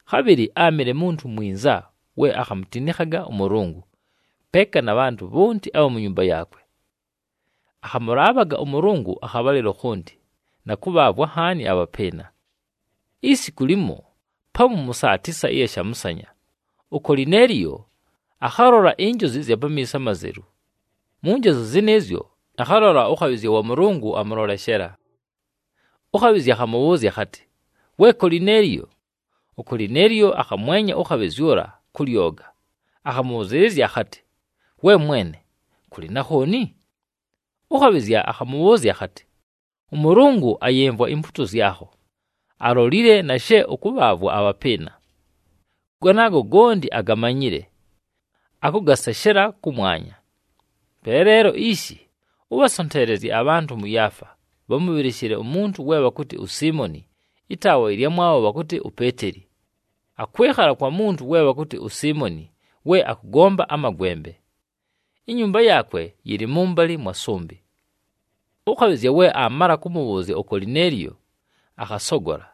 Khabhɨlɨ áamɨle muntu mwinza we akhamutinikhaga ʉMʉlʉngʉ, peeka na bhantʉ bhonti abha mu nyumba yaakwe. Akhamʉlaabhaga ʉMʉlʉngʉ akhabhalɨlo khonti, na kʉbhaavwa nhaani abhapɨɨna. Isiku limo pamu mʉ saa tisa ɨya shamʉsanya, uKolineeliyo akhalola injozi ɨzya pamiiso amazelu. Mu njozi zɨnɨɨzyo, akhalola ʉkhabhɨzya wa Mʉlʉngʉ amʉloleshela. Ʉkhabhɨzya akhamʉbhʉʉzya akhatɨ, “We Kolineeliyo!” UKolineeliyo akhamwenya ʉkhabhɨzya ʉla kʉ lyoga, akhamʉbhʉzɨɨlɨzya akhatɨ, “We mwene, kʉlɨ na khooni?” Ʉkhabhɨzya akhamʉbhʉʉzya akhatɨ, “ɄMʉlʉngʉ ayɨmvwa impuuto zyakho, alolile na she ʉkʉbhaavwa abhapɨɨna. Ganaago gonti agamanyile, akʉgaseshela kʉmwanya. Pe leelo ishi, ʉbhasonteelezye abhantʉ mʉ Yaafa, bhamʉbhɨlɨshɨle umuntu we bhakʉtɨ uSiimoni, ɨtaawa ɨlyamwabho bhakʉtɨ uPeeteli. Akwɨkhala kwa muntu we bhakʉtɨ uSiimoni, we akʉgomba amagwembe. Inyumba yaakwe yɨlɨ mʉmbalɨ mwa sʉmbɨ.” Ʉkhabhɨzya we aamala kʉmʉbhʉʉzya uKolineeliyo, akhasogola.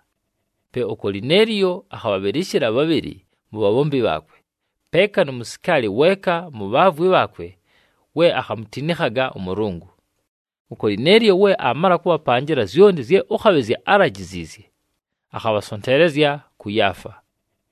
Pe uKolineeliyo akhabhabhɨlɨshɨla bhabhɨlɨ mu bhabhombi bhaakwe, peeka nu musikaali weeka mu bhaavwi bhaakwe we akhamutinikhaga ʉMʉlʉngʉ. UKolineeliyo we aamala kʉbhapanjɨla zyonti zye ʉkhabhɨzya álajiziizye, akhabhasonteelezya kʉ Yaafa.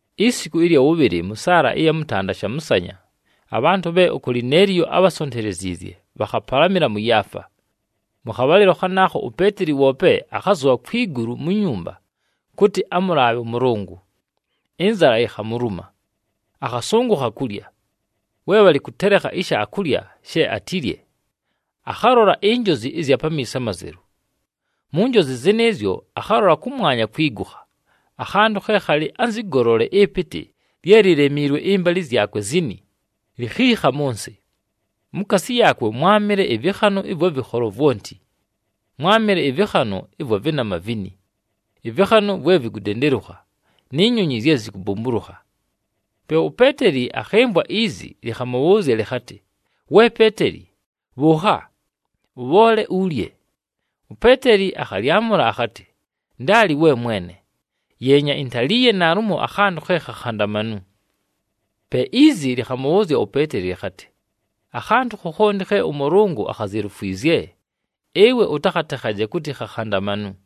Isiku ɨlya wʉbhɨlɨ mʉ saala ɨya mʉtanda shamʉsanya, abhantʉ bhe uKolineeliyo ábhasonteleziizye, bhakhapalamɨla mʉ Yaafa. Mʉ khabhalɨlo khanaakho uPeeteli woope akhazʉbha kwi gulu mu nyumba, kʉtɨ amʉlaabhe ʉMʉlʉngʉ. Ɨnzala yikhamuluma, akhasʉngʉkha kulya. We bhalɨ kʉtelekha ishaakulya she atilye, akhalola injozi ɨzya pamiiso amazelu. Mu njozi zɨnɨɨzyo, akhalola kʉmwanya kwigukha, akhantʉ khe khalɨ anzɨ golole ɨpɨtɨ lye lilemiilwe ɨmbalɨ zyakwe zini, likhiikha mʉ nsɨ. Mukaasi yaakwe mwámɨle ɨvɨkhanʉ ɨvwa vɨkholo vwonti. Mwámɨle ɨvɨkhanʉ ɨvwa vɨnama vini, ɨvɨkhanʉ vwe vikudendelukha, ni nyonyi zye zikubumbulukha. Pe uPeeteli akhɨmvwa izi, lɨkhamʉbhʉʉzya lɨkhatɨ, “We Peeteli, bhʉʉkha! Ʉbhoole ulye!” UPeeteli akhalyamʉla akhatɨ, “Ndaali, we Mwene! Yeenya, intaliiye naalumo akhantʉ khe khakhandamanu!” Pe izi lɨkhamʉbhʉʉzya uPeeteli lɨkhatɨ, “Akhantʉ khokhonti khe ʉMʉlʉngʉ akhazelufwizye, ɨwe ʉtakhatekhaje kʉtɨ khakhandamanu.”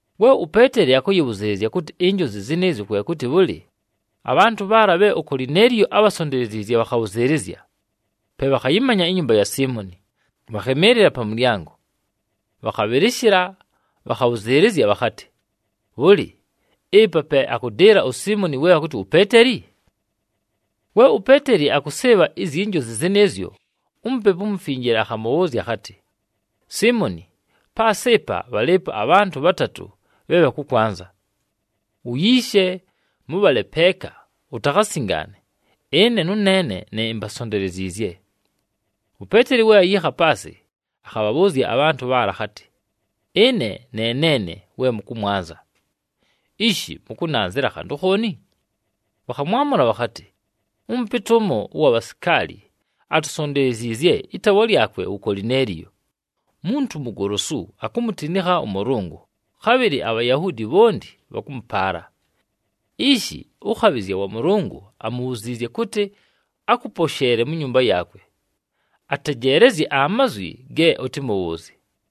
We uPeeteli akʉyɨbhʉzɨɨlɨzya kʉtɨ injozi zɨnɨɨzyo kwe kʉtɨ bhʉlɨ, abhantʉ bhaala bhe uKolineeliyo ábhasonteleziizye bhakhabhʉzɨɨlɨzya, pe bhakhayɨmanya inyumba ya Siimoni, bhakhɨmɨɨlɨla pa mʉlyango. Bhakhabhɨlɨshɨla, bhakhabhʉzɨɨlɨzya bhakhatɨ, “Bhʉlɨ, ɨpa pe akʉdɨɨla uSiimoni we bhakʉtɨ uPeeteli?” We uPeeteli akʉsɨɨbha izyi njozi zɨnɨɨzyo, uMupepu uMufinjile akhamʉbhʉʉzya akhatɨ, “Siimoni, paasɨ ɨpa bhalɨɨpo abhantʉ bhatatʉ bhe bhakʉkwanza. Uyiishe, mʉbhale peeka, utakhasingaane, ɨne nʉneene ne imbasonteleziizye.” UPeeteli we ayiikha paasɨ, akhabhabhʉʉzya abhantʉ bhaala akhatɨ, “Ɨne ne neene we mʉkʉmwanza. Ishi! Mʉkʉnanzɨla khantʉ khooni?” Bhakhamwamʉla bhakhatɨ, “Ʉmʉpɨtɨ ʉmo ʉwa bhasikaali atusonteleziizye, ɨtaawa lyakwe wu Kolineeliyo, muntu mugolosu, akumutinikha ʉMʉlʉngʉ, khabhɨlɨ aBhayahuudi bhonti bhakʉmʉpaala. Ishi ʉkhabhɨzya wa Mʉlʉngʉ amubhuziizye kʉtɨ akʉposheele mu nyumba yaakwe, atejeelezye amazwi ge ʉtɨmʉbhʉʉzye.”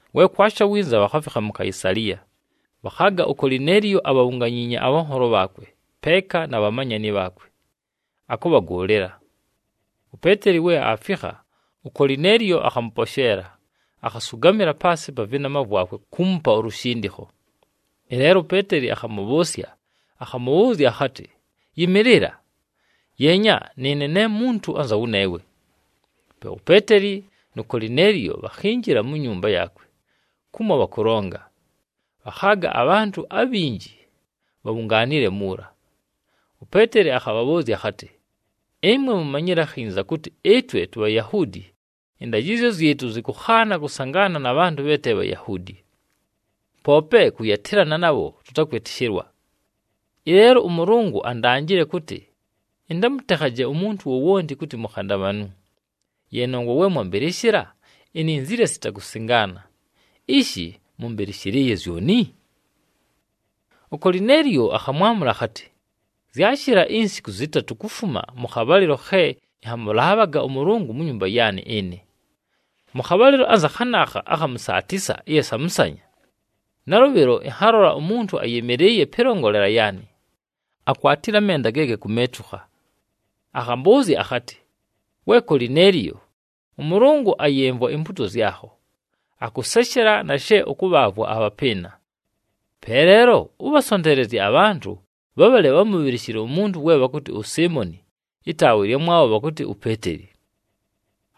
We kwasha winza, bhakhafikha mu Kaisaliya. Bhakhaaga uKolineeliyo abhabhunganyiinye abhanholo bhaakwe, peeka na bhamanyani bhaakwe, akʉbhagʉʉlɨla. UPeeteli we aafikha, uKolineeliyo akhamʉposheela, akhasʉgamɨla paasɨ pa vɨnama vwakwe kuumupa ulushindikho. Ɨleelo uPeeteli akhamʉbhʉʉsya, akhamʉbhʉʉzya akhatɨ, “Yɨmɨɨlɨla! Yeenya, nɨɨne ne muntu anza wʉneewe!” Pe uPeeteli nu Kolineeliyo bhakhinjila mu nyumba yaakwe kumo bhakʉlonga, bhakhaaga abhantʉ abhinji bhabhungaanile muula. UPeeteli akhabhabhʉʉzya akhatɨ, “Ɨmwe mumanyile akhinza kʉtɨ ɨtwe tuBhayahuudi ɨndajɨzyo zyɨtʉ zɨkʉkhaana kʉsangaana na bhantʉ bhe te Bhayahuudi. Poope kʉyatɨlana nabho tʉtakwɨtɨshɨlwa. Ɨleelo ʉMʉlʉngʉ andanjile kʉtɨ ɨntamʉtekhaje umuntu wowonti kʉtɨ mukhandamanu. Ye nongwa we mwambɨlɨshɨla, ininzile sita kusingaana. Ishi, mʉmbɨlɨshɨlɨɨye zyoni?” UKolineeliyo akhamwamʉla akhatɨ, “Zyashɨla insiku zɨtatʉ kufuma mʉ khabhalɨlo khe ɨnhamʉlaabhaga ʉMʉlʉngʉ mu nyumba yaanɨ ɨnɨ, mʉ khabhalɨlo anza khanaakha akha mʉ saa tisa ɨya shamʉsanya. Nalʉbhɨlo ɨnhalola umuntu ayɨmɨlɨɨye pɨlongolela yaanɨ, akwatile amenda ge gakumeetukha. Akhambʉʉzya akhatɨ, ‘We Kolineeliyo, ʉMʉlʉngʉ ayɨmvwa impuuto zyakho, akʉseshela na she ʉkʉbhaavwa abhapɨɨna. Pe leelo, ʉbhasonteelezye abhantʉ bhabhale bhamʉbhɨlɨshɨle umuntu we bhakʉtɨ uSiimoni, ɨtaawa ɨlyamwabho bhakʉtɨ uPeeteli.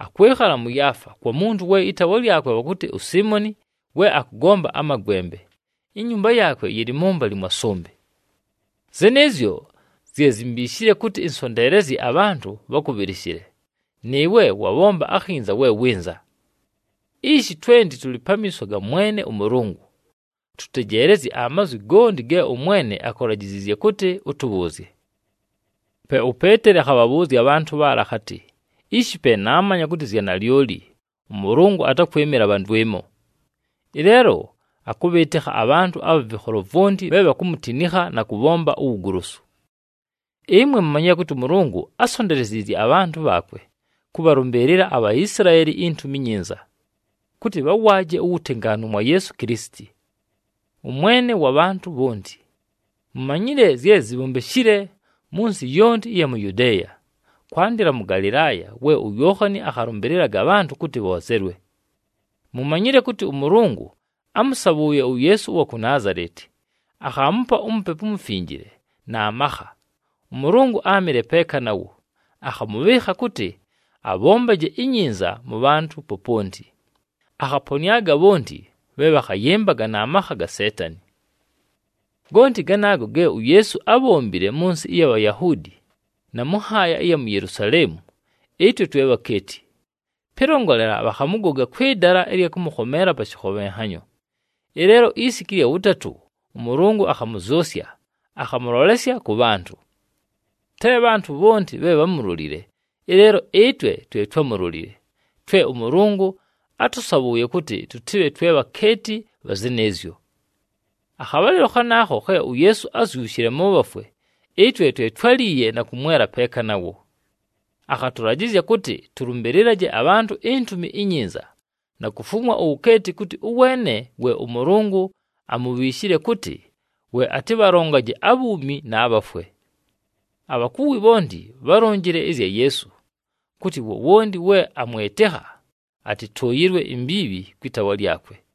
Akwɨkhala mʉ Yaafa, kwa muntu we ɨtaawa lyakwe bhakʉtɨ uSiimoni we akʉgomba amagwembe. Inyumba yaakwe yɨlɨ mʉmbalɨ mwa sʉmbɨ.’ Zɨnɨɨzyo zye zimbiishile kʉtɨ ɨnsonteelezye abhantʉ bhakʉbhɨlɨshɨle, nɨɨwe wabhomba akhinza we wɨnza. Ishi twenti tʉlɨ pamiiso ga Mwene ʉMʉlʉngʉ, tʉtejeelezye amazwi gonti ge ʉMwene akulajiziizye kʉtɨ ʉtʉbhʉʉzye.” Pe uPeeteli akhabhabhʉʉzya abhantʉ bhaala akhatɨ, “Ishi pe naamanya kʉtɨ zya nalyoli, ʉMʉlʉngʉ atakwɨmɨla bha ndwɨmo! Ɨleelo akʉbhɨɨtɨkha abhantʉ abha vɨkholo vwonti bhe bhakumutinikha na kʉbhomba uwugolosu. Ɨmwe mumanyile kʉtɨ ʉMʉlʉngʉ ásonteleziizye abhantʉ bhaakwe kʉbhalʉmbɨɨlɨla aBhaisilaeli iNtumi iNyinza, kʉtɨ bhawaaje uwutengaanu mwa Yeesu Kilisiti, ʉMwene wa bhantʉ bhonti. Mumanyile zye zibhombeshile mʉ nsɨ yonti ɨya mu Yudeeya, kwandɨla mʉ Galɨlaaya, we uYookhani akhalʉmbɨlɨlaga abhantʉ kʉtɨ bhoozelwe. Mumanyile kʉtɨ ʉMʉlʉngʉ ámʉsabhʉʉye uYeesu ʉwa ku Naazaleti, akhaamupa uMupepu uMufinjile, na makha. ɄMʉlʉngʉ áamɨle peeka nawo, akhamʉbhɨɨkha kʉtɨ abhombaje inyinza mʉ bhantʉ poponti, akhaponɨaga bhonti bhe bhakhayɨmbaga na makha ga Seetani. “Gonti ganaago ge uYeesu ábhombile mʉ nsɨ ɨya Bhayahuudi, na mʉ nhaaya ɨya mu Yelusaleemu, ɨtwe twe bhakeeti. Pɨlongolela, bhakhamʉgoga kwɨ dala ɨlya kʉmʉkhomeela pa shɨkhobhenhanyo. Ɨleelo isiku ɨlya wʉtatʉ, ʉMʉlʉngʉ akhamʉzyʉsya, akhamʉlolesya kʉ bhantʉ. Te bhantʉ bhonti bhe bhámulolile, ɨleelo ɨtwe twe twámulolile, twe ʉMʉlʉngʉ átʉsabhʉʉye kʉtɨ tʉtɨbhe twe bhakeeti bha zɨnɨɨzyo. Akhabhalɨlo khanaakho khe uYeesu ázyushile mʉ bhafwe, ɨtwe twe twáliiye na kʉmwela peeka nawo. Akhatʉlajɨzya kʉtɨ tʉlʉmbɨlɨlaje abhantʉ iNtumi iNyinza, na kufumwa uwukeeti kʉtɨ ʉweene we ʉMʉlʉngʉ amubhiishile kʉtɨ we atɨbhalongaje abhuumi, na bhafwe. Abhakuwi bhonti bhálonjile ɨzya Yeesu, kʉtɨ wowonti we amwɨtɨkha atɨtʉʉyɨlwe imbiibhi kwɨ taawa lyakwe.”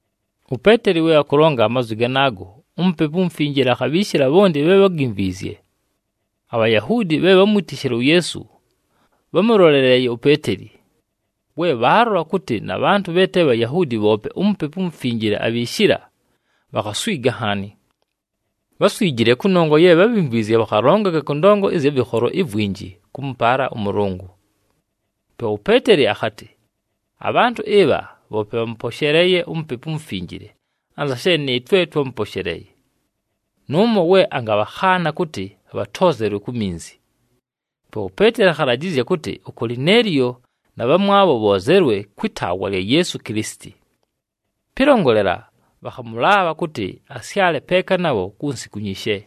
UPeeteli we akʉlonga amazwi ganaago, uMupepu uMufinjile akhabhiishila bhonti bhe bhágimvwizye. ABhayahuudi bhe bhámwitishile uYeesu bhámʉloleleeye uPeeteli, we bhaalola kʉtɨ na bhantʉ bhe te Bhayahuudi bhoope uMupepu uMufinjile abhiishila, bhakhaswiga nhaani. Bháswijile kʉnongwa ye bhábhimvwizye bhakhalongaga kʉ ndongo ɨzya vɨkholo ivwinji kʉmʉpaala ʉMʉlʉngʉ. Pe uPeeteli akhatɨ, “Abhantʉ ɨbha bhoope bhamʉposheleeye uMupepu uMufinjile anza she nɨɨtwe twámʉposheleeye. Nʉʉmo we angabhakhaana kʉtɨ bhatoozelwe ku minzi!” Pe uPeeteli akhalajɨzya kʉtɨ uKolineeliyo na bhamwabho bhoozelwe kwɨ taawa lya Yeesu Kilisiti. Pɨlongolela, bhakhamʉlaabha kʉtɨ asyale peeka nabho ku nsiku nyishe.